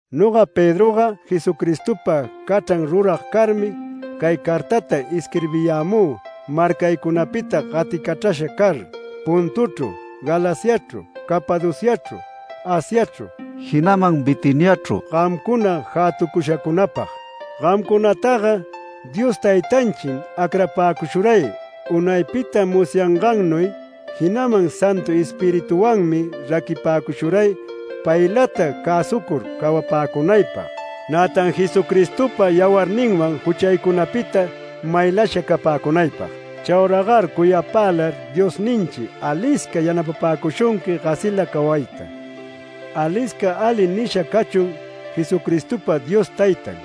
Noga Pedroga Jesucristopa cachran rurag carmi cay cartata isquirbiyämü marcaycunapita gaticachrasha car; Pontochru, Galaciachru, Capadociachru, Asiachru, jinaman Bitiniachru gamcuna jätucushacunapag. Gamcunataga Dios Taytanchim acrapäcushuray unaypita musyangannuy, jinaman Santu Espiritunwanmi raquipäcushuray paylata cäsucur cawapäcunaypag, nätan Jesucristopa yawarninwan juchaycunapita maylasha capäcunaypag. Chauragar cuyapälar Diosninchi alisca yanapapäcushunqui gasila cawayta. Alisca ali nisha cachun Jesucristopa Dios Taytan.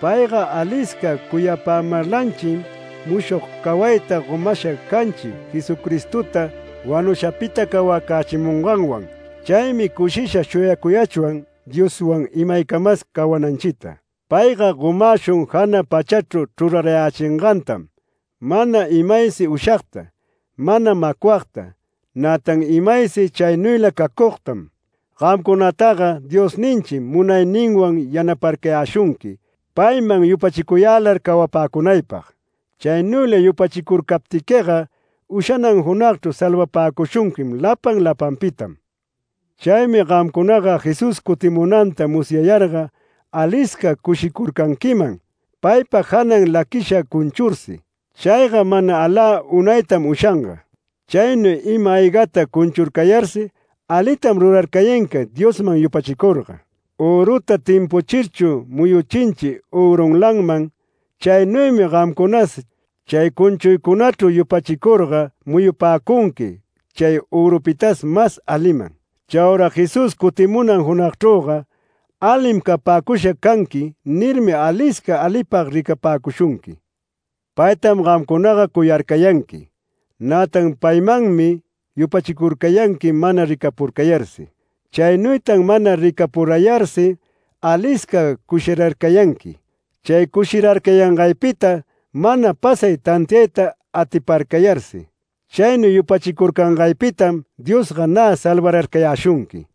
Payga alisca cuyapämarlanchim mushog cawayta gomasha canchi Jesucristota wanushacunapita cawacächimunganwan. Chaymi cushisha shuyacuyachwan Dioswan imaycamas cawananchita. Payga gomäshun jana pachachru chrurarayächingantam, mana imaysi ushagta, mana macwagta, nätan imaysi chaynuyla cacugtam. Gamcunataga Diosninchim munayninwan yanaparcayäshunqui payman yupachicuyälar cawapäcunaypag. Chaynuyla yupachicurcaptiquiga ushanan junagchru salvapäcushunqui lapan lapanpitam. Chaymi gamcunaga Jesús cutimunanta musyayarga alisca cushicurcanquiman, paypa janan laquisha cunchursi. Chayga mana alä unaytam ushanga. Chaynuy ima-aygata cunchurcayarsi alitam rurarcayanqui Diosman yupachicurga. Öruta timpuchirchu muyuchinchi örunlanman, chaynuymi gamcunas chay cunchuycunachru yupachicurga muyupäcunqui chay örupitas mas aliman. Chaura Jesús cutimunan junagchrüga “Alim capäcusha canquim” nirmi alisca alipag ricapäcushunqui. Paytam gamcunaga cuyarcayanqui. Nätan paymanmi yupachicurcayanqui mana ricapurayarsi. Chaynuytan mana ricapurayarsi alisca cushirarcayanqui. Chay cushirarcayangaypita mana pasay tantiayta atiparcayarsi. Chaynuy yupachicurcangaypitam Diosga nä salvarcayäshunqui.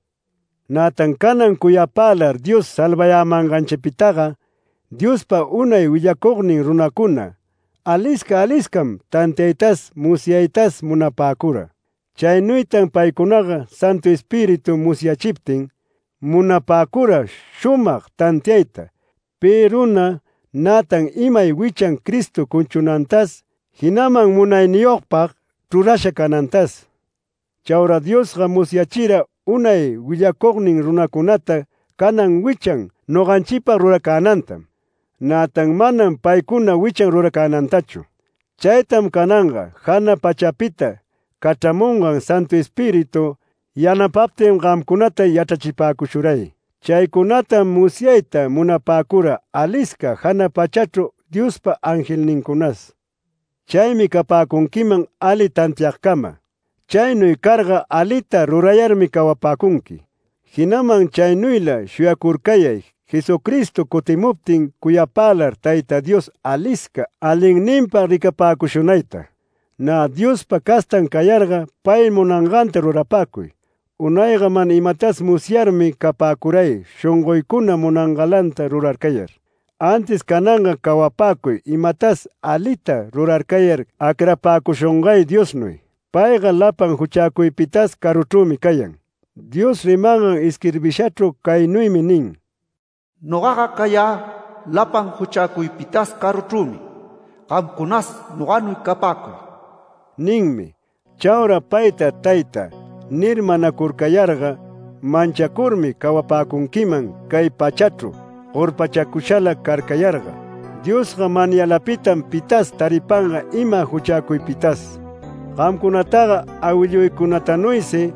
Nätan canan cuyapälar Dios salvayämanganchipitaga, Diospa unay willacugnin runacuna, alisca aliscam tantiaytas musyaytas munapäcura. Chaynuytan paycunaga Santu Espíritu musyachiptin munapäcura shumag tantiayta, pi runa nätan imay wichan Cristo cunchunantas jinaman munayniyogpag chrurasha canantas. Chaura Diosga musyachira unay willacugnin runacunata canan wichan noganchipag ruracänantam, nätan manam paycuna wichan ruracänantachu. Chaytam cananga, jana pachapita cachramungan Santu Espíritu yanapaptin gamcunata yachrachipäcushuray. Chaycunatam musyayta munapäcura alisca jana pachachru Diospa angelnincunas. Chaymi capäcunquiman ali tantiagcama. Chaynuy carga alita rurayarmi cawapäcunqui, jinaman chaynuyla shuyacurcayay Jesucristo cutimuptin cuyapälar Tayta Dios alisca alinninpag ricapäcushunayta. Nä Diospa castan cayarga pay munanganta rurapäcuy. Unayga mana imatas musyarmi capäcuray shongoycuna munangalanta rurarcayar. Antis cananga cawapäcuy imatas alita rurarcayar acrapäcushungay Diosnuy. Payga lapan juchacuypitas caruchrümi cayan. Dios rimangan isquirbishachru caynuymi nin: “Nogaga cayä lapan juchacuypitas caruchrümi. Gamcunas noganuy capäcuy” ninmi. Chaura payta “Taytä” nir manacurcayarga, manchacurmi cawapäcunquiman cay pachachru gorpachacushala carcayarga, Diosga manyalapitam pitas taripanga ima juchäcuypitas. Gamcunataga awilluycunatanuysi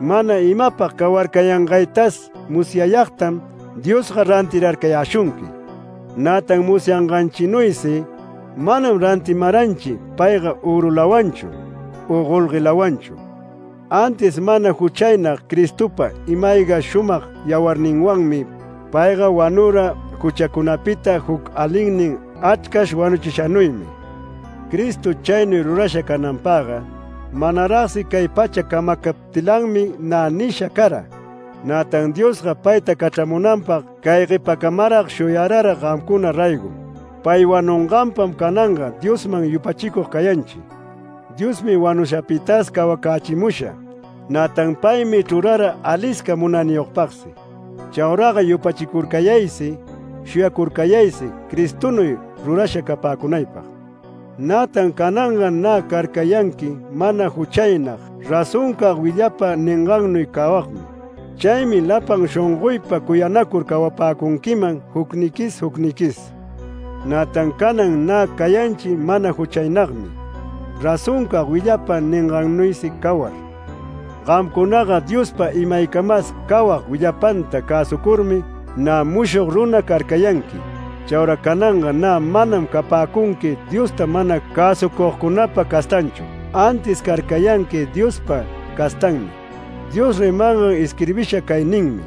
mana imapag cawarcayangaytas musyayagtam Diosga rantirarcayäshunqui. Nätan musyanganchinuysi manam rantimaranchi payga örulawanchu u golguelawanchu, antis mana juchaynag Cristopa ima-ayga shumag yawarninwanmi. Payga wanura juchacunapita juc alinnin achrcash wanuchishanuymi. Cristo chaynuy rurasha cananpagga, manaragsi cay pacha camacaptilanmi nä nisha cara. Nätan Diosga payta cachramunanpag cay guepacamarag shuyarara gamcuna raygom. Pay wanunganpam cananga Diosman yupachicug cayanchi. Diosmi wanushapitas cawacächimusha, nätan paymi chrurara alisca munayniyogpagsi. Chauraga yupachicurcayaysi shuyacurcayaysi Cristonuy rurasha capäcunaypag. Nätan cananga nä carcayanqui mana juchaynag razoncag willapa ningannuy cawagmi. Chaymi lapan shongoypa cuyanacur cawapäcunquiman jucniquis jucniquis. Nätan canan nä cayanchi mana juchaynagmi, razoncag willapa ningannuysi cawar. Gamcunaga Diospa imaycamas cawag willapanta cäsucurmi, nä mushog runa carcayanqui. Chaura cananga nä manam capäcunqui Diosta mana cäsucugcunapa castanchu, antis carcayanqui Diospa castanmi. Dios rimangan isquirbisha cay ninmi: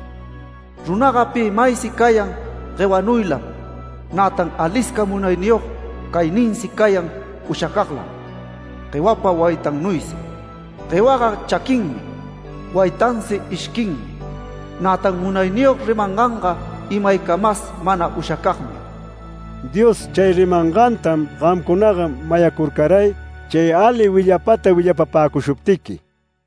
“Runaga pi maysi cayan guewanuylam. Nätan alisca munayniyog cayninsi cayan ushacaglam, guewapa waytannuysi. Guewaga chaquinmi, waytansi ishquinmi. Nätan Munayniyog rimanganga imaycamas mana ushacagmi”. Dios chay rimangantam gamcunaga mayacurcaray chay ali willapata willapapäcushuptiqui.